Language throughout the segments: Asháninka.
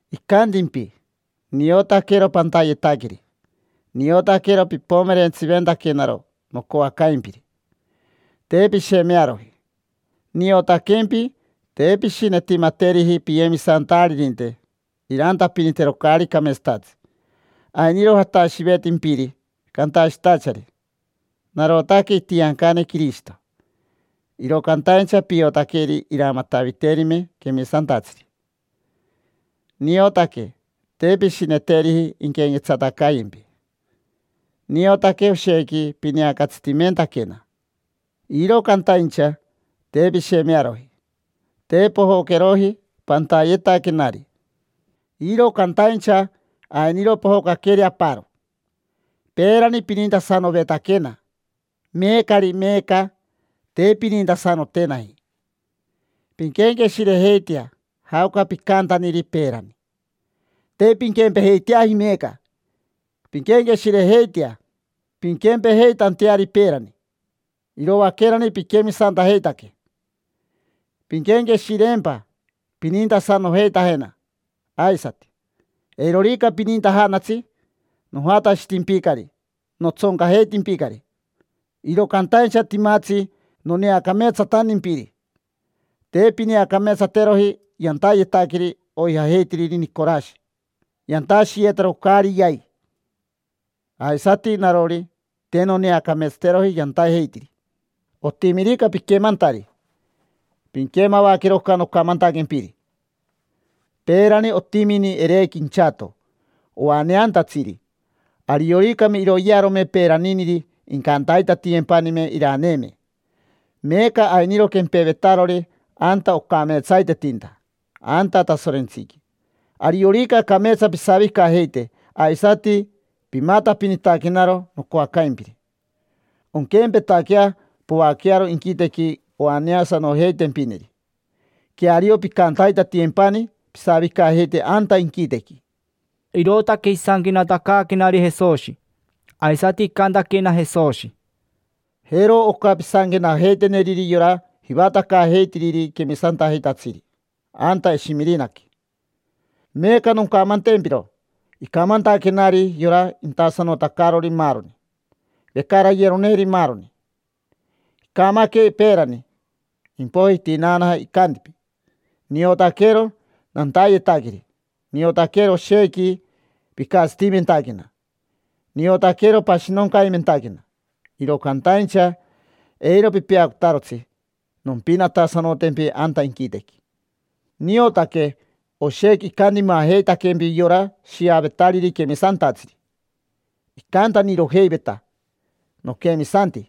Icantimpi: ‘Niotaquero pantayetaqueri, niotaquero pipomerentsiventaquenaro nocoacaimpiri, te pishemearoji. Niotaquempi te pishinetimateriji piyemisantaririnte irantapinitero caari cameetsatatsi. Ainiro jatashivetimpiri cantashitachari: “Narotaque itiancane Quirishito”, iro cantaincha piotaqueri iramataviterime quemisantatsiri: niotaque te pishineteriji inquenquetsatacayempi. Niotaque oshequi pineacatsitimentaquena, iro cantaincha te pishemearoji, te pojocajeroji pantayetaquenari. Iro cantaincha ainiro pojocaqueri aparo: peerani pinintasanovetaquena; meecari, meeca te pinintasanotenaji. Pinquenqueshirejeitea jaoca picantaniri peerani; te pinquempejeiteaji meeca. Pinquenqueshirejeitea pinquempejeitanteari peerani, iroaquerani piquemisantajeitaque. Pinquenqueshireempa, pinintasanojeitajena aisati. Eirorica pinintajanatsi, nojatashitimpicari, notsoncajeitimpicari. Iro cantaincha timatsi noneacameetsatantimpiri: te pineacameetsateroji yantayetaqueri oijajeitiriri Nicorashi, yantashiyetaro caari yai. Aisati narori, te noneacameetsateroji yantajeitiri. Otimirica piquemantari, pinquemavaquero oca nocamantaquempiri. Peerani otimini Erequi inchato oaneantatsiri: arioricame iroyearome peeraniniri, incantaitatiyempanime iraneeme. Meeca ainiro quempevetarori anta ocameetsaitetinta, anta Tasorentsiqui. Ariorica cameetsa pisavicajeite aisati pimatapinitaquenaro nocoacaimpiri, onquempetaquea poaquearo inquitequi oaneasanojeitempineri: queario pincantaitatiyempani pisavicajeite anta inquitequi’”. Irootaque isanquenatacaaquenari Jesoshi. Aisati icantaquena Jesoshi: —Jero oca pisanquenajeiteneriri yora jivatacaajeitiriri quemisantajeitatsiri anta Eshimirinaqui: “Meeca noncamantempiro icamantaquenari yora intasanotacarori maaroni, vecarayeroneri maaroni. Icamaque peerani, impoiji itinaanaja. Icantimpi: ‘Niotaquero pantayetaqueri, niotaquero oshequi picatsitimentaquena, niotaquero pashinoncaimentaquena: iro cantaincha eiro pipeacotarotsi nompinatasanotempi anta inquitequi. Niotaque oshequi icantimajeitaquempi yora shiavetariri quemisantatsiri. Icantanirojeiveta: “Noquemisanti”.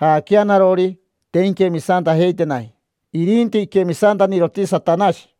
Jaaquea narori, te inquemisantajeitenaji, irinti iquemisantaniroti Satanashi.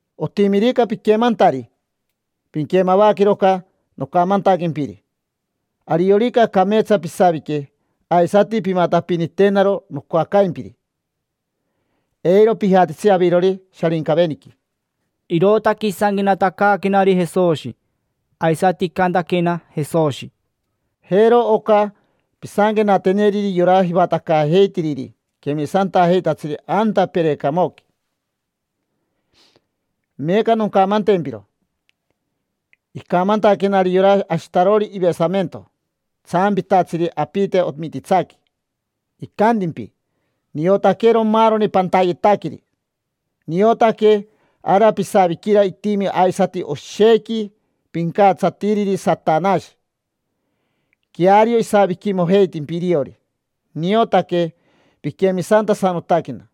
Otimirica piquemantari, pinquemavaquero oca nocamantaquempiri. Ariorica cameetsa pisavique aisati pimatapinitenaro nocoacaimpiri, eiro pijatitsi avirori Sharincaveniqui’”. Irootaque isanquenatacaaquenari Jesoshi. Aisati icantaquena Jesoshi: —Jero oca pisanquenateneriri yora jivatacaajeitiriri quemisantajeitatsiri anta Perecamoqui: “Meeca noncamantempiro icamantaquenari yora ashitarori ivesamento, tsampitatsiri apite omititsaqui. Icantimpi: ‘Niotaquero maaroni pantayetaqueri, niotaque ara pisaviquira itimi aisati oshequi pincatsatiriri Satanashi: queario isaviquimojeitimpi iriori. Niotaque piquemisantasanotaquena,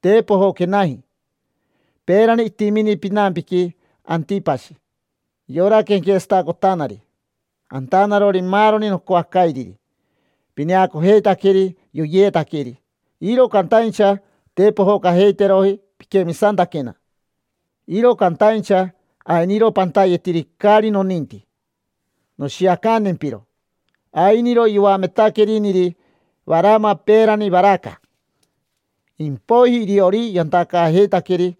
te pojoquenaji. Peerani itimini pinampiqui Antipashi: yora quenquetsatacotanari, antanarori maaroni nocoacairiri. Pineacojeitaqueri yoyeetaqueri, iro cantaincha te pojocajeiteroji piquemisantaquena. Iro cantaincha ainiro pantayetiri caari noninti. Noshiacantempiro: ainiro yoametaqueriniri Varama peerani Varaca; impoiji iriori yantacaajeitaqueri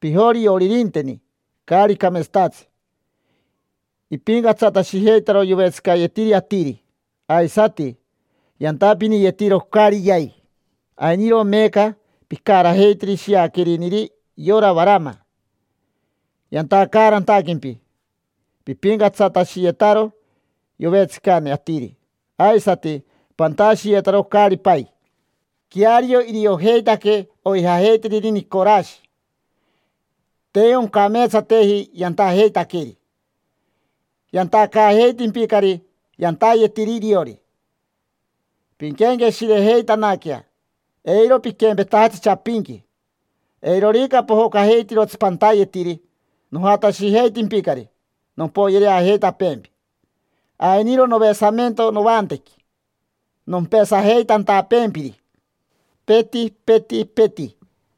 pijorioririnteni caari cameetsatatsi: ipincatsatashijeitaro yovetsicayetiri atiri aisati yantapiniyetiro caari yai. Ainiro meeca picarajeitiri shiaqueriniri yora Varama: yantacaarantaquempi pipincatsatashiyetaro yovetsicane atiri aisati pantashiyetaro caari pai. Queario iriojeitaque oijajeitiriri Nicorashi. Te oncameetsateji yantajeitaqueri: yantacaajeitimpicari yantayetiri iriori. Pinquenqueshirejeitanaquea, eiro piquempetajatsi chapinqui. Eirorica pojocajeitirotsi pantayetiri, nojatashijeitimpicari nompoyereajeitapeempi. Ainiro novesamento novantequi nompesajeitantapeempiri, peti, peti, peti.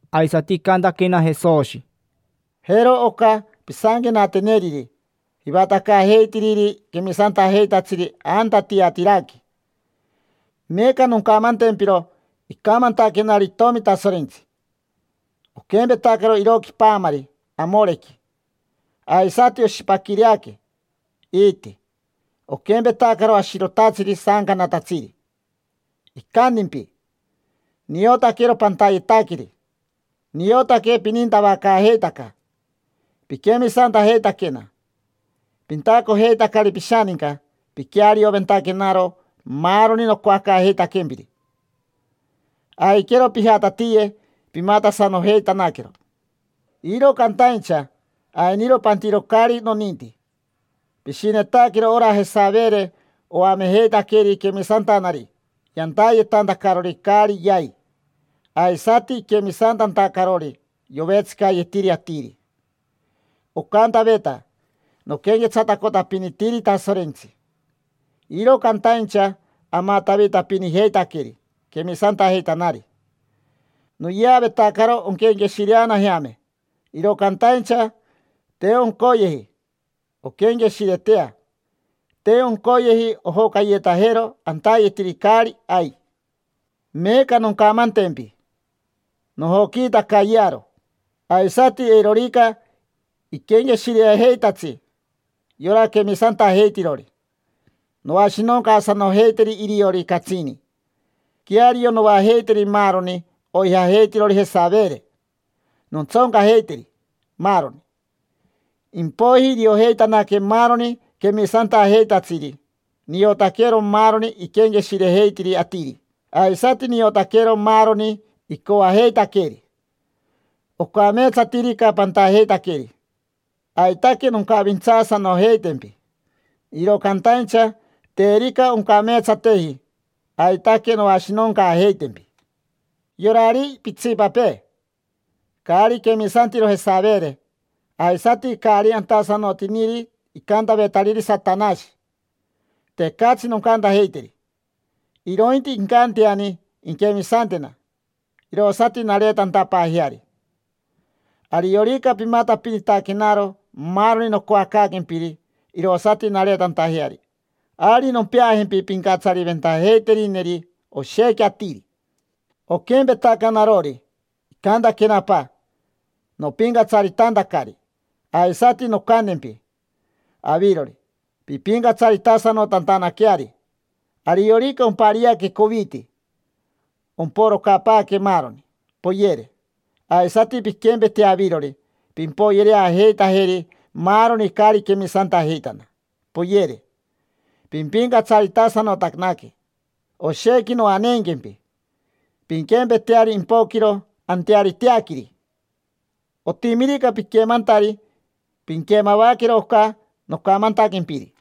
Aisati icantaquena Jesoshi: —Jero oca pisanquenateneriri jivatacaajeitiriri quemisantajeitatsiri anta Tiatiraqui: “Meeca noncamantempiro icamantaquenari Itomi Tasorentsi: oquempetacaro iroqui paamari amorequi, aisati oshipaquireaque iiti, oquempetacaro ashirotatsiri saancanatatsiri. Icantimpi: ‘Niotaquero pantayetaqueri. Niotaque pinintavacaajeitaca, piquemisantajeitaquena, pintacojeitacari pishaninca, piquearioventaquenaro maaroni nocoacaajeitaquempiri. Aiquero pijatatiye pimatasanojeitanaquero. Iro cantaincha ainiro pantiro caari noninti: pishinetaquero ora Jesavere oamejeitaqueri quemisantanari yantayetantacarori caari yai aisati iquemisantantacarori yovetsicayetiri atiri. Ocantaveta: “Noquenquetsatacotapinitiri Tasorentsi”, iro cantaincha amatavitapinijeitaqueri quemisantajeitanari. Noyeavetacaro onquenqueshireanajeame; iro cantaincha te oncoyeji onquenqueshiretea, te oncoyeji ojocayetajero antayetiri caari ai. Meeca noncamantempi: nojoquiitacayearo, aisati eirorica iquenqueshireajeitatsi yora quemisantajeitirori, noashinoncaasanojeiteri iriori catsini. Queario noajeiteri maaroni oijajeitirori Jesavere, nontsoncajeiteri, maaroni. Impoiji iriojeitanaque maaroni quemisantajeitatsiri niotaquero maaroni iquenqueshirejeitiri atiri aisati niotaquero maaroni icoajeitaqueri. Ocameetsatirica pantajeitaqueri, aitaque noncavintsaasanojeitempi; iro cantaincha terica oncameetsateji, aitaque noashinoncaajeitempi. Yorari pitsipapee, caari quemisantiro Jesavere, aisati caari antasanotiniri icantavetariri Satanashi, tecatsi noncantajeiteri; irointi incanteani inquemisantena irosati nareetantapaajeari. Ariorica pimatapinitaquenaro maaroni nocoacaaquempiri irosati nareetantajeari, ari nompeajempi pincatsariventajeiterineri oshequi atiri. Oquempetaca narori, icantaquena Apa nopincatsaritantacari, aisati noncantempi avirori pimpincatsaritasanotantanaqueari. Ariorica ompariaque coviti, omporocapaaque maaroni, poyere; aisati pinquempetea avirori: pimpoyereajeitajeri maaroni caari quemisantajeitana, poyere. Pimpincatsaritasanotanaque, oshequi noaneenquempi, pinquempeteari impoquiro anteariteaquiri. Otimirica piquemantari, pinquemavaquero oca nocamantaquempiri’”.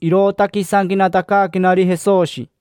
Irootaque isanquenatacaaquenari Jesoshi.